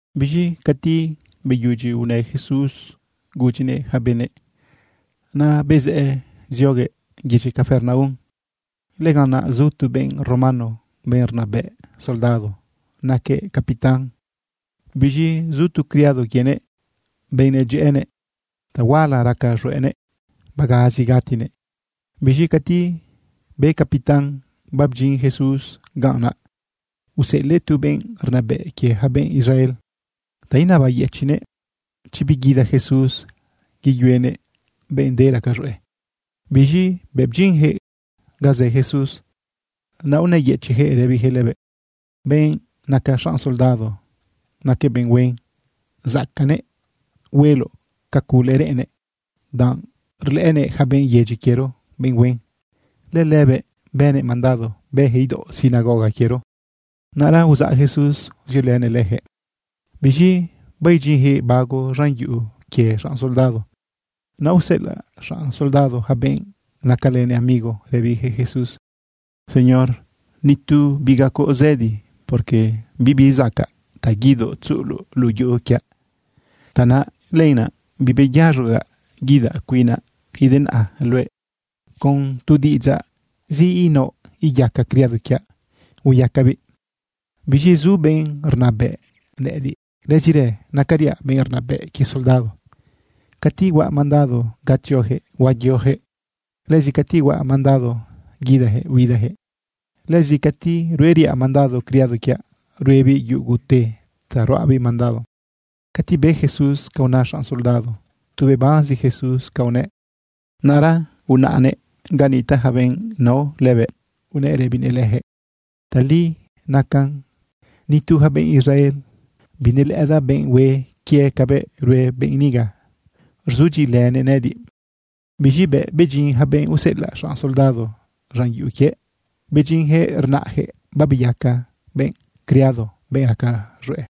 Biz̃i cati beyudyi unë Jesús gudyinëꞌ yaca benëꞌ, naꞌ bezëꞌë zioguëꞌ yedyi Capernaum. Lëganꞌ naꞌ zu tu benꞌ romano, benꞌ rnabëꞌ soldado, naquëꞌ capitán. Biz̃i zu tu criado quienëꞌ, benꞌ nedyëꞌënëꞌ, tahuala raca z̃hueꞌnëꞌ, bagazi gatinëꞌ. Biz̃i cati be capitán babdyin Jesús ganꞌ, naꞌ useꞌelëꞌ tu benꞌ rnabëꞌ quie yaca benꞌ Israel ta inabayëchiꞌnëꞌ chi biguida Jesús yeyuenëꞌ benꞌ de raca z̃hueꞌ. Biz̃i bëꞌ bdyinyaquëꞌ ga zë Jesús, naꞌ unëyëchiꞌyaquëꞌ rëbiyaquëꞌ lëbëꞌ: ―Benꞌ naca xanꞌ soldado, naquëꞌ benꞌ huen, zacaꞌnëꞌ hueloꞌ ca cule reꞌennëꞌ, danꞌ rlëꞌënëꞌ yaca benꞌ yedyi quiero benꞌ huen. Lëlëbëꞌ bënëꞌ mandado bëyaquëꞌ idaoꞌ sinagoga quiero. Naꞌra uzaꞌ Jesús ziolënëꞌ leyaquëꞌ. Biz̃i baidyinyaquëꞌ bago z̃an yuꞌu quie xanꞌ soldado, naꞌ useꞌelaꞌ xanꞌ soldado yaca benꞌ nacalënëꞌ amigo rëbiyaquëꞌ Jesús: ―Señor, ni tu bigacoꞌ zëdi, porque bibi zacaꞌ ta guidoꞌ tzuꞌuloꞌ luꞌu yuꞌu quiaꞌ. Tanaꞌ lenaꞌ bibeyaz̃ogaꞌ guidaꞌ cuinaꞌ denaꞌa luëꞌ. Con tu diꞌidzaꞌzi inaoꞌ iyaca criado quiaꞌ hueyacabiꞌ. Biz̃i zu benꞌ rnabëꞌ nëꞌëdiꞌ. Lëzirë nacariaꞌ benꞌ rnabëꞌ quie soldado. Cati huaꞌ mandado ga tzioyaquëꞌ, huayoyaquëꞌ. Lëzi cati huaꞌ mandado guidayaquëꞌ, huidayaquëꞌ. Lëzi cati rueriaꞌ mandado criado quiaꞌ, ruebiꞌ yugute ta ruaꞌbiꞌ mandado. Cati be Jesús ca una xanꞌ soldado, tu bebanzi Jesús ca unëꞌ. Naꞌra unaꞌnëꞌ ga nitaꞌ yaca benꞌ nao lëbëꞌ, unëꞌ rëbinëꞌ leyaquëꞌ: ―Tali nacan. Ni tu yaca benꞌ Israel, binelëꞌëdaꞌ benꞌ hue quie cabëꞌ rue benꞌ niga, rzudyiꞌilënëꞌ nëꞌëdiꞌ. Biz̃i bëꞌ bedyin yaca benꞌ useꞌelaꞌ xanꞌ soldado z̃an yuꞌu quiëꞌ, bedyinyaquëꞌ rnaꞌyaquëꞌ babeyaca benꞌ criado, benꞌ raca z̃hueꞌ.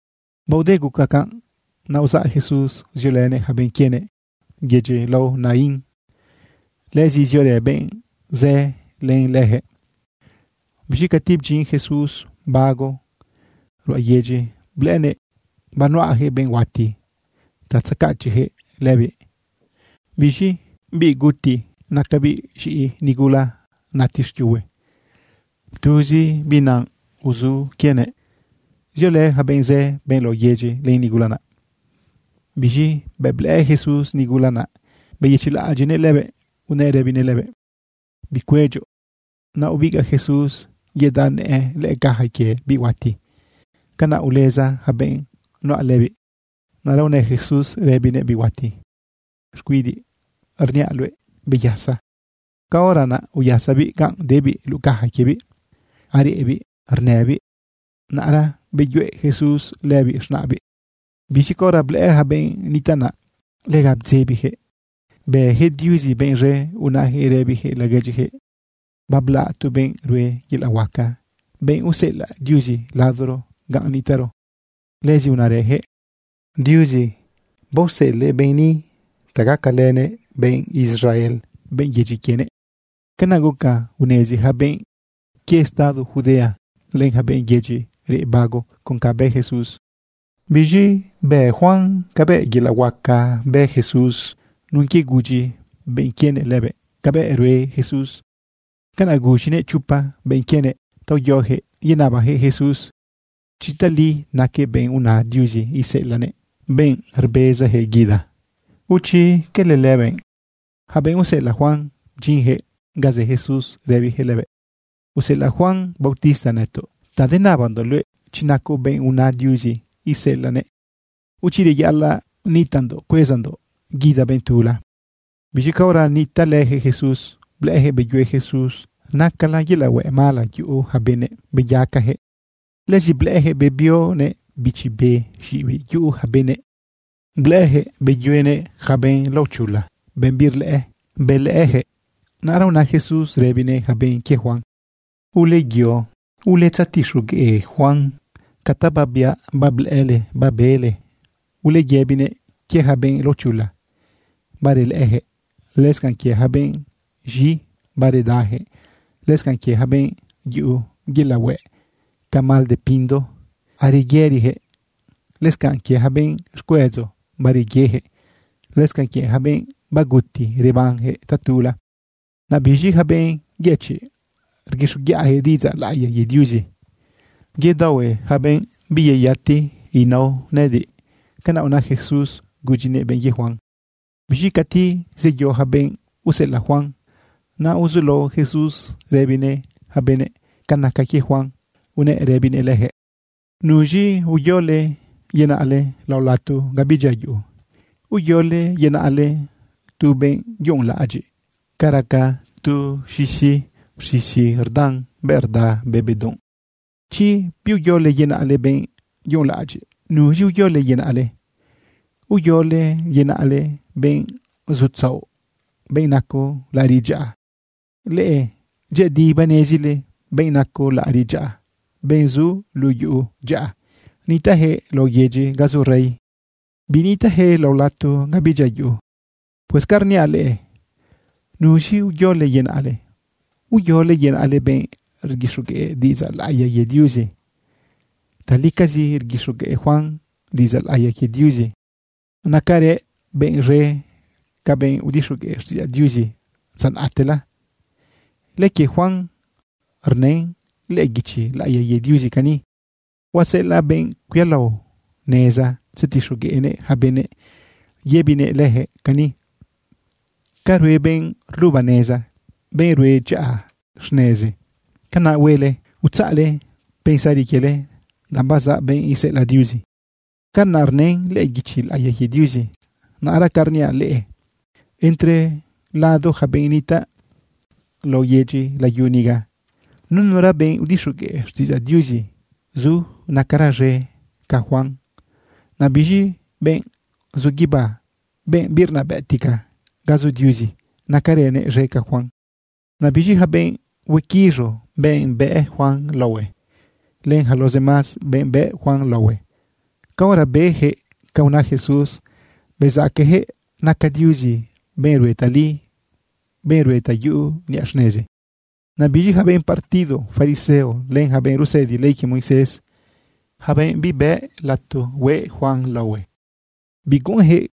Baode guca canꞌ, naꞌ uzaꞌ Jesús ziolënëꞌ yaca benꞌ quienëꞌ yedyi lao Naín. Lëzi ziorë benꞌ zë len leyaquëꞌ. Biz̃i cati bdyin Jesús bago ruꞌa yedyi, blëꞌënëꞌ banuꞌayaquëꞌ benꞌ huati ta tzacachiꞌyaquëꞌ lëbiꞌ. Biz̃i biꞌ guti nacabiꞌ z̃iꞌi nigula nati xquiuhue. Tuzi biꞌ naꞌ uzu quienëꞌ. Ziolë yaca benꞌ zë, benꞌ lao yedyi, len nigula naꞌ. Biz̃i bëꞌ blëꞌë Jesús nigula naꞌ, beyëchiꞌlaꞌadyiꞌnëꞌ lëbëꞌ, unëꞌ rëbinëꞌ lëbëꞌ: ―Bicuedyoꞌ. Naꞌ ubigaꞌ Jesús yedaꞌ nëꞌë lëꞌë caja quie biꞌ huati. Canaꞌ uleza yaca benꞌ nuꞌa lëbiꞌ. Naꞌra unë Jesús rëbinëꞌ biꞌ huati: ―Xcuidiꞌ, rniaꞌ luëꞌ: ¡Beyasa! Caora naꞌ uyasabiꞌ ganꞌ debiꞌ luꞌu caja quiebiꞌ, areꞌbiꞌ, rnëbiꞌ. Naꞌra beyuꞌe Jesús lëbiꞌ z̃naꞌbiꞌ. Biz̃i caora blëꞌë yaca benꞌ nitaꞌ naꞌ, lega bdzebiyaquëꞌ. Bëyaquëꞌ Diuzi benꞌ z̃e unayaquëꞌ rëbiyaquëꞌ laguedyiyaquëꞌ: ―Bablaꞌ tu benꞌ rue yelaꞌ huaca, benꞌ useꞌelaꞌ Diuzi ladoro ganꞌ nitaꞌro. Lëzi unarëyaquëꞌ: ―Diuzi baoseꞌelëꞌ benꞌ ni ta gacalënëꞌ benꞌ Israel, benꞌ yedyi quienëꞌ. Canaꞌ guca unezi yaca benꞌ quie estado Judea, len yaca benꞌ yedyi reꞌ bago con canꞌ bë Jesús. Biz̃i be Juan cabëꞌ yelaꞌ huaca bë Jesús nun quie gudyi benꞌ quienëꞌ lëbëꞌ cabëꞌ rue Jesús. Canaꞌ guz̃inëꞌ chopa benꞌ quienëꞌ ta uyoyaquëꞌ yenabayaquëꞌ Jesús chi tali naquëꞌ benꞌ una Diuzi iseꞌelaꞌnëꞌ, benꞌ rbezayaquëꞌ guida, o chi cala lëbëꞌ. Yaca benꞌ useꞌelaꞌ Juan bdyinyaquëꞌ ga zë Jesús rëbiyaquëꞌ lëbëꞌ: ―Useꞌelaꞌ Juan bautista nëtoꞌ ta denabandoꞌ luëꞌ chi nacoꞌ benꞌ una Diuzi iseꞌelaꞌnëꞌ, o chi reyaꞌalaꞌ nitaꞌndoꞌ cuezandoꞌ guida benꞌ tula. Biz̃i caora nitaꞌlëyaquëꞌ Jesús, blëꞌëyaquëꞌ beyue Jesús nacala yelaꞌ hueꞌ mala yuꞌu yaca benëꞌ, beyacayaquëꞌ. Lëzi blëꞌëyaquëꞌ bebionëꞌ bichi be xiꞌibiꞌ yuꞌu yaca benëꞌ, blëꞌëyaquëꞌ beyuenëꞌ yaca benꞌ laochula, benꞌ birlëꞌë, belëꞌëyaquëꞌ. Naꞌra una Jesús rëbinëꞌ yaca benꞌ quie Juan: ―Uleyo uletzetixogueꞌ Juan ca ta babiaꞌ bablëꞌële babele. Uleyëbinëꞌ quie yaca benꞌ laochula, barelëꞌëyaquëꞌ, lëscanꞌ quie yaca benꞌ z̃i, baredayaquëꞌ, lëscanꞌ quie yaca benꞌ yuꞌu yelaꞌ hueꞌ ca mal de pindo, areyëriyaquëꞌ, lëscanꞌ quie yaca benꞌ xcuedzo, bareyeyaquëꞌ, lëscanꞌ quie yaca benꞌ baguti, rebanyaquëꞌ tatula. Naꞌ biz̃i yaca benꞌ yëchiꞌ, rguixoguiꞌayaquëꞌ diꞌidzaꞌ laꞌiya quie Diuzi. Yedaohue yaca benꞌ biyeyati inao nëꞌëdiꞌ. ―Canaꞌ una Jesús gudyinëꞌ benꞌ quie Juan. Biz̃i cati zeyo yaca benꞌ useꞌelaꞌ Juan, naꞌ uzulao Jesús rëbinëꞌ yaca benëꞌ ca naca quie Juan, unëꞌ rëbinëꞌ leyaquëꞌ: ―¿Nuz̃i uyole yenaꞌle lao lato ga bidyia yuꞌu? ¿Uyole yenaꞌle tu benꞌ yunꞌlaꞌadyiꞌ ca raca tu z̃isi rz̃izi rdan bëꞌ rda be bedunꞌ? Chi biuyole yenaꞌle benꞌ yunꞌlaꞌadyiꞌ, ¿nuz̃i uyole yenaꞌle? ¿Uyole yenaꞌle benꞌ zutzaoꞌ, benꞌ naco laꞌariꞌ dyaꞌa? Leꞌe dyëꞌëdi banezile benꞌ naco laꞌariꞌ dyaꞌa, benꞌ zu luꞌu yuꞌu dyaꞌa, nitaꞌyaquëꞌ laoꞌ yedyi ga zu rey, binitaꞌyaquëꞌ lao lato ga bidyia yuꞌu. Pues ca rniaꞌ leꞌe, ¿nuz̃i uyole yenaꞌle? ¿Uyole yenaꞌle benꞌ rguixogueꞌ diꞌidzaꞌ laꞌiya quie Diuzi? Talicazi rguixogueꞌ Juan diꞌidzaꞌ laꞌiya quie Diuzi. Nacarëꞌ benꞌ z̃e ca benꞌ udixogueꞌ xtiꞌidzaꞌ Diuzi dza naꞌtela. Lëquie Juan rnën lëꞌë guichi laꞌiya quie Diuzi cani: Huaseꞌelaꞌ benꞌ cuialao neza tzetixogueꞌnëꞌ yaca benëꞌ yëbinëꞌ leyaquëꞌ cani: “Ca rue benꞌ rluba neza, benꞌ rue dyaꞌa xnezi, canaꞌ huele utzaꞌle pensari quiele, danꞌ bazaꞌ benꞌ iseꞌelaꞌ Diuzi.” Canaꞌ rnën lëꞌë guichi laꞌiya quie Diuzi. Naꞌra ca rniaꞌ leꞌe, entre lado yaca benꞌ nitaꞌ lao yedyi layu niga, nunura benꞌ udixogueꞌ xtiꞌidzaꞌ Diuzi zu nacara z̃e ca Juan. Naꞌ biz̃i, benꞌ zu guibá, benꞌ birnabëꞌtica ga zu Diuzi, nacaranëꞌ z̃e ca Juan. Naꞌ biz̃i yaca benꞌ huequiz̃u, benꞌ bëꞌ Juan laohue, len yaca los demás benꞌ bëꞌ Juan laohue, caora beyaquëꞌ ca una Jesús, bezaqueyaquëꞌ naca Diuzi benꞌ rue tali, benꞌ rue ta yuꞌu niꞌa xnezi. Naꞌ biz̃i yaca benꞌ partido fariseo, len yaca benꞌ rusëdi ley quie Moisés, yaca benꞌ bibë lato hueꞌ Juan laohue, biguꞌunyaquëꞌ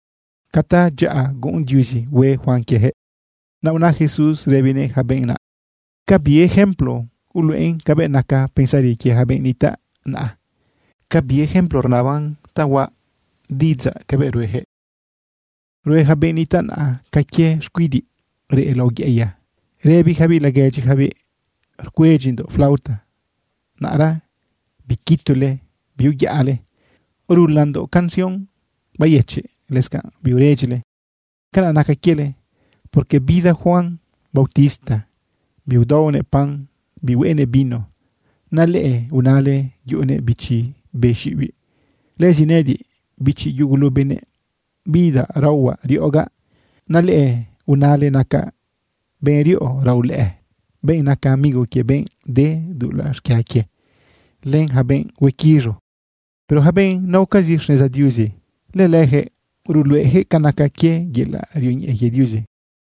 ca tadyaꞌa guꞌun Diuzi hue Juan quieyaquëꞌ. Naꞌ una Jesús rëbinëꞌ yaca benꞌ naꞌ: ―¿Ca bi ejemplo uluꞌen cabëꞌ naca pensari quie yaca benꞌ nitaꞌ naꞌa? ¿Ca bi ejemplo rnaban ta huaꞌ diꞌidzaꞌ cabëꞌ rueyaquëꞌ? Rue yaca benꞌ nitaꞌ naꞌa ca quie xcuidiꞌ reꞌ lao yeꞌeya rëbiyacabiꞌ laguedyiyacabiꞌ: “Rcuedyindoꞌ flauta, naꞌra biquitule biuyaꞌale. Rulandoꞌ canción bayëchiꞌ, lëscanꞌ biuredyile.” Canaꞌ naca quiele, porque bida Juan bautista, biudaonëꞌ pan, bihueꞌenëꞌ vino, naꞌ leꞌe unale yuꞌunëꞌ bichi be xiꞌibiꞌ. Lëzi nëꞌëdiꞌ, bichi yugulu benëꞌ, bidaꞌ raohuaꞌ riꞌogaꞌ, naꞌ leꞌe unale nacaꞌ benꞌ riꞌo raolëꞌë, benꞌ naca amigo quie benꞌ de dulaꞌ xquia quie, len yaca benꞌ huequiz̃u. Pero yaca benꞌ naocazi xneza Diuzi, lëleyaquëꞌ ruluꞌeyaquëꞌ ca naca quie yelaꞌ rioñeꞌe quie Diuzi.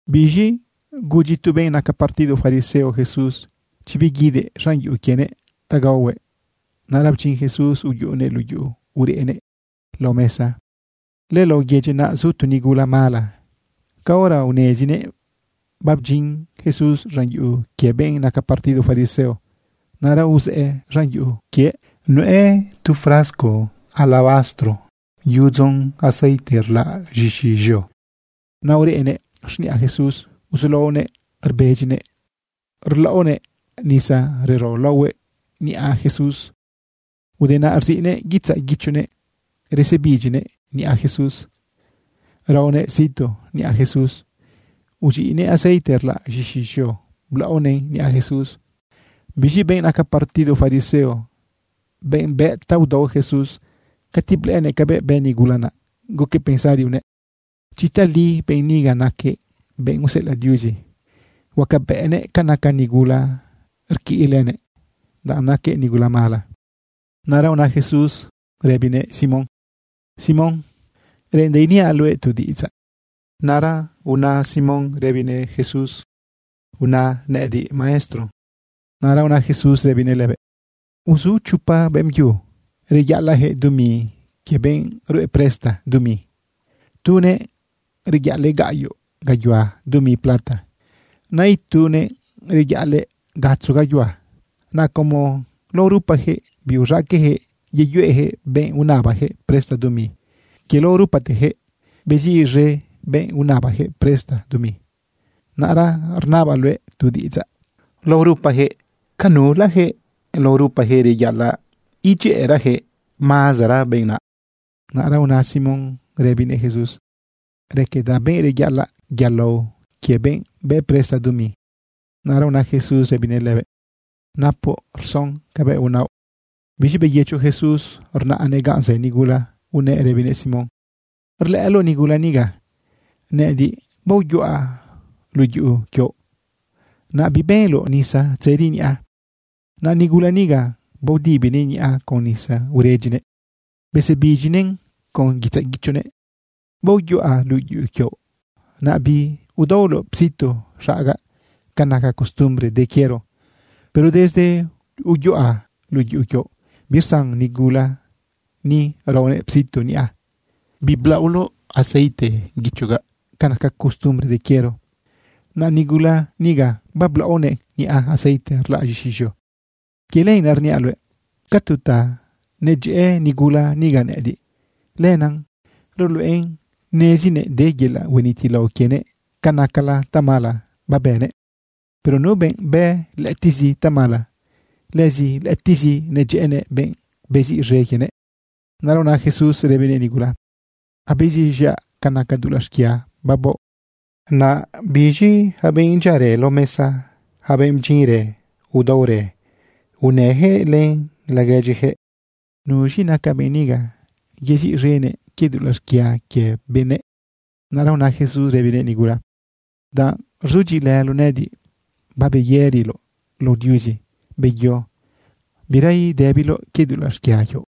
Biz̃i gudyi tu benꞌ naca partido fariseo Jesús chi biguidëꞌ z̃an yuꞌu quienëꞌ ta gaohuëꞌ. Naꞌra bdyin Jesús uyuꞌunëꞌ luꞌu yuꞌu ureꞌnëꞌ lao mesa. Lëlao yedyi naꞌ zu tu nigula mala. Caora unezinëꞌ babdyin Jesús z̃an yuꞌu quie benꞌ naca partido fariseo, naꞌra uzëꞌë z̃an yuꞌu quiëꞌ nuꞌë tu frasco alabastro yudzon aceite rlaꞌ z̃ixi z̃eo. Naꞌ ureꞌnëꞌ xniꞌa Jesús uzulaonëꞌ rbedyinëꞌ, rlaꞌonëꞌ nisa rero laohuëꞌ niꞌa Jesús. Ude naꞌ rziꞌnëꞌ guitzaꞌ guichonëꞌ resebidyinëꞌ niꞌa Jesús, raonëꞌ situ niꞌa Jesús, uz̃iꞌnëꞌ aceite rlaꞌ z̃ixi z̃eo, blaꞌonëꞌn niꞌa Jesús. Biz̃i benꞌ naca partido fariseo, benꞌ bëꞌ ta udao Jesús, cati blëꞌënëꞌ cabëꞌ bë nigula, naꞌ guquëꞌ pensari unëꞌ: “Chi tali benꞌ niga naquëꞌ benꞌ useꞌelaꞌ Diuzi, huacabëꞌnëꞌ ca naca nigula rquiꞌ lënëꞌ, danꞌ naquëꞌ nigula mala.” Naꞌra una Jesús rëbinëꞌ Simón: ―Simón, reꞌendaꞌ iniaꞌ luëꞌ tu diꞌidzaꞌ. Naꞌra una Simón rëbinëꞌ Jesús: ―Una nëꞌëdiꞌ, maestro. Naꞌra una Jesús rëbinëꞌ lëbëꞌ: ―Uzu chopa beꞌmbyu reyaꞌalaꞌyaquëꞌ dumi quie benꞌ rue presta dumi. Tunëꞌ reyaꞌalëꞌ gaꞌyoꞌ gayuhua dumi plata. Naꞌ itunëꞌ reyaꞌalëꞌ gatzo gayuhua. Naꞌ como lao rupayaquëꞌ biuz̃aqueꞌyaquëꞌ yeyuꞌeyaquëꞌ benꞌ unabayaquëꞌ presta dumi, quie lao rupateyaquëꞌ beziꞌz̃e benꞌ unabayaquëꞌ presta dumi. Naꞌra rnabaꞌ luëꞌ tu diꞌidzaꞌ: Lao rupayaquëꞌ, ¿ca nulayaquëꞌ lao rupayaquëꞌ reyaꞌalaꞌ gacayaquëꞌ agradecer mazara quie benꞌ naꞌ? Naꞌra una Simón rëbinëꞌ Jesús: ―Raquedaꞌ benꞌ reyaꞌalaꞌ yalao quie benꞌ bë presta dumi. Naꞌra una Jesús rëbinëꞌ lëbëꞌ: ―Napoꞌ rson cabëꞌ unaoꞌ. Biz̃i beyëcho Jesús rnaꞌnëꞌ ganꞌ zë nigula, unëꞌ rëbinëꞌ Simón: ―¿Rlëꞌëloꞌ nigula niga? Nëꞌëdiꞌ baoyuꞌa luꞌu yuꞌu quioꞌ, naꞌ bibenloꞌ nisa tzëri niꞌa. Naꞌ nigula niga baodibinëꞌ niꞌa con nisa uredyinëꞌ besebidyinëꞌn con guitzaꞌ guichonëꞌ. Baoyuꞌa luꞌu yuꞌu quioꞌ, naꞌ biudaoloꞌ situ xagaꞌ ca naca costumbre de quiero. Pero desde uyuꞌa luꞌu yuꞌu quioꞌ, birsan nigula ni raonëꞌ situ niꞌa. Biblaꞌoloꞌ aceite guichogaꞌ ca naca costumbre de quiero, naꞌ nigula niga bablaꞌonëꞌn niꞌa aceite rlaꞌ z̃ixi z̃eo. Quie lenaꞌ rniaꞌ luëꞌ, ca tu ta nedyëꞌë nigula niga nëꞌëdiꞌ, lenaꞌ ruluꞌen nezinëꞌ de yelaꞌ huenitilao quienëꞌ ca nacala tamala babënëꞌ. Pero nu benꞌ bë lëꞌëtiꞌzi tamala, lëzi lëꞌëtiꞌzi nedyëꞌënëꞌ benꞌ beziꞌz̃e quienëꞌ. Naꞌra una Jesús rëbinëꞌ nigula: ―Abeziꞌz̃iaꞌ ca naca dulaꞌ xquia babaoꞌ. Naꞌ biz̃i yaca benꞌ dyiarë lao mesa, yaca benꞌ bdyinrë udaorë, unayaquëꞌ laguedyiyaquëꞌ: ―¿Nuz̃i naca benꞌ niga yeziꞌz̃enëꞌ quie dulaꞌ xquia quie benëꞌ? Naꞌra una Jesús rëbinëꞌ nigula: ―Danꞌ rzudyiꞌilëloꞌ nëꞌëdiꞌ, babeyëriloꞌ lao Diuzi. Beyo, bira idëbiloꞌ quie dulaꞌ xquia quioꞌ.